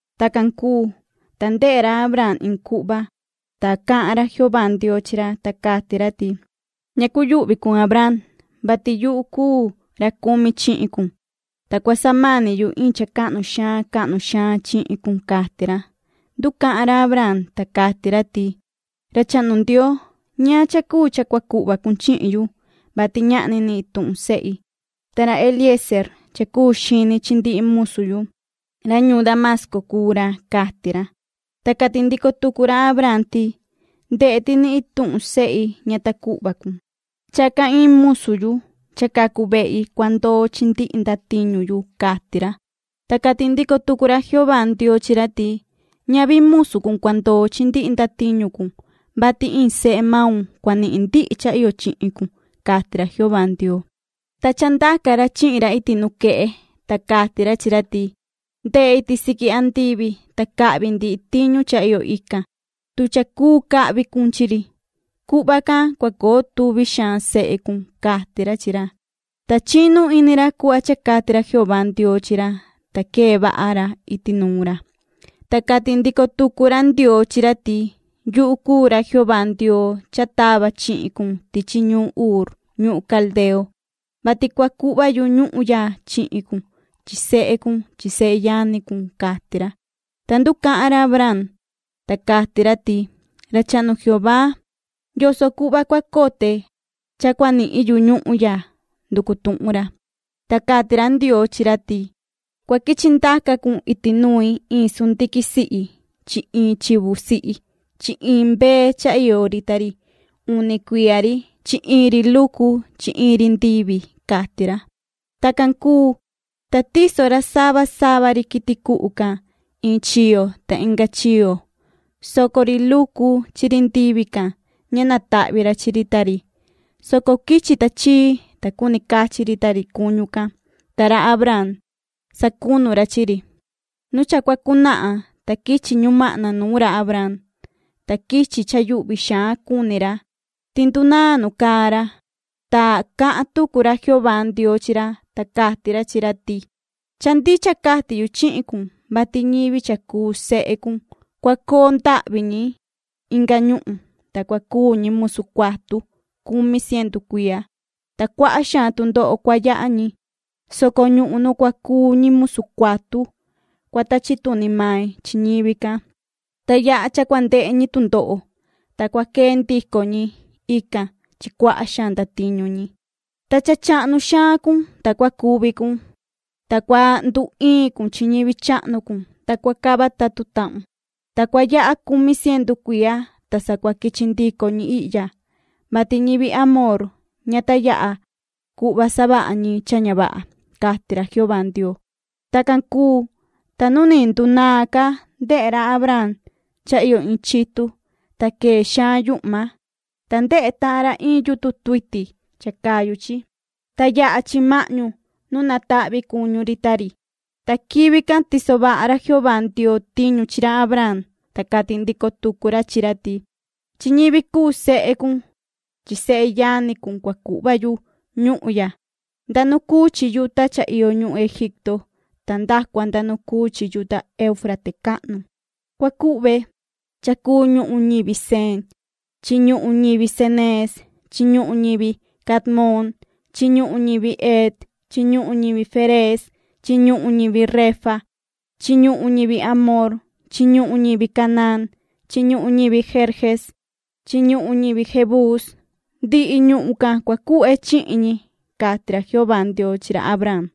Tacan cuu, ta ndehe ra Abraam iin cuhva, ta cahan ra Jehová Ndioo chi ra, ta cati ra ti: ―Ña cuyuhvi cun Abraam, vati yuhu cuu ra cumi chihin cun, ta cua samani yu iin cha cahnu xaan cahnu xaan chihin cun ―cati ra. Nducahan ra Abraam, ta cati ra ti: ―Ra chahnu Ndioo ¿ñaan cha cuu cha cua cuhva cun chihin yu, vati ñahni ni ituhun sehi? Ta ra Eliezeer cha cuu xini chi ndihi musu yu, ra ñuun Damasco cuu ra ―cati ra. Ta cati ndico tucu ra Abraam ti: ―Ndehe ti ni ituhun sehi ña ta cuhva cun. Chacan iin musu yu cha cacu vehi cua ndoo chi ndihi ndatiñu yu ―cati ra. Ta cati ndico tucu ra Jehová Ndioo chi ra ti: ―Ñavi musu cun cua ndoo chi ndihi ndatiñu cun, vati iin sehe maun cua nihin ndihi cha iyo chihin cun ―cati ra Jehová Ndioo. Ta cha ndaca ra chihin ra iti nuquehe, ta cati ra chi ra ti: ―Ndehe iti siqui andivi, ta cahvi ndihi tiñu cha iyo ican, tu cha cuu cahvi cun chi ri. Cuhva can cua coo tuvi xaan sehe cun ―cati ra chi ra. Ta chinu ini ra cuhva cha cati ra Jehová Ndioo chi ra, ta quee vaha ra iti nuun ra. Ta cati ndico tucu ra Ndioo chi ra ti: ―Yuhu cuu ra Jehová Ndioo cha tava chihin cun tichi ñuun Uur, ñuhun Caldeo, vati cua cuhva yu ñuhun ya chihin cun chi sehe cun chi seyani cun ―cati ra. Ta nducahan ra Abraam, ta cati ra ti: ―Ra chahnu Jehová ¿yoso cuhva cua cote cha cua nihin yu ñuhun ya? ―nducu tuhun ra. Ta cati ra Ndioo chi ra ti: ―Cua quichi ndaca cun iti nui iin sundiquin sihi chi iin chivu sihi chi iin mbee cha iyo ri ta ri uni cuiya ri chi iin ri lucu chi iin ri ndivi ―cati ra. Tacan cuu, ta tiso ra sava sava ri quiti cuhu can iin chiyo ta inga chiyo, soco ri lucu chi ri ndivi can, ña natahvi ra chi ri ta ri, soco quichi tachii cha cuni cachi ri ta ri cuñu can, ta ra Abraam sacunu ra chi ri. Nu cha cua cunahan, ta quichi ñumahna nuun ra Abraam, ta quichi cha yuhvi xaan cuni ra, ti ndunaan nu caa ra. Ta cahan tucu ra Jehová Ndioo chi ra, ta cati ra chi ra ti: ―Cha ndicha cati yu chihin cun, vati ñivi cha cuu sehe cun cua coo ndahvi ñi inga ñuhun, ta cua cuu ñi musu cuatu cumi cientu cuiya, ta cuaha xaan tundoho cua yaha ñi, soco ñuhun nu cua cuu ñi musu cuatu cua tachi tuni mai chi ñivi can, ta yaha cha cua ndehe ñi tundoho, ta cua quee ndico ñi ican chi cuaha xaan ndatiñu ñi. Ta cha chahnu xaan cun, ta cua cuvi cun, ta cua nduiin cun chi ñivi chahnu cun, ta cua cava tatu tahun. Ta cua yaha cumi cientu cuiya, ta sa cua quichi ndico ñi ihya, vati ñivi amorreo ña ta yaha cuhva savaha ñi cha ña vaha ―cati ra Jehová Ndioo. Tacan cuu, ta nu ni ndunaan ca ndehe ra Abraam cha iyo iin chitu, ta quee xaan yuhma, ta ndehe tahan ra iin yutun tuiti cha cayu chi, ta yaha chi mahñu nu natahvi cuñu ri ta ri. Ta quivi can tiso vaha ra Jehová Ndioo tiñu chi ra Abraam, ta cati ndico tucu ra chi ra ti: ―Chi ñivi cuu sehe cun chi seyani cun cua cuhva yu ñuhun ya nda nu cuu chi yuta cha iyo ñuhun Egipto ta nda cua nda nu cuu chi yuta Euufrate cahnu. Cua cuhve cha cuu ñuhun ñivi ceneo chi ñuhun ñivi Ceneez chi ñuhun ñivi Cadmon chi ñuhun ñivi Het chi ñuhun ñivi Ferez chi ñuhun ñivi refaíta chi ñuhun ñivi amorreo chi ñuhun ñivi Canaán chi ñuhun ñivi Gerges chi ñuhun ñivi Jebús. Ndihi ñuhun can cua cuhve chihin ñi ―cati ra Jehová Ndioo chi ra Abraam.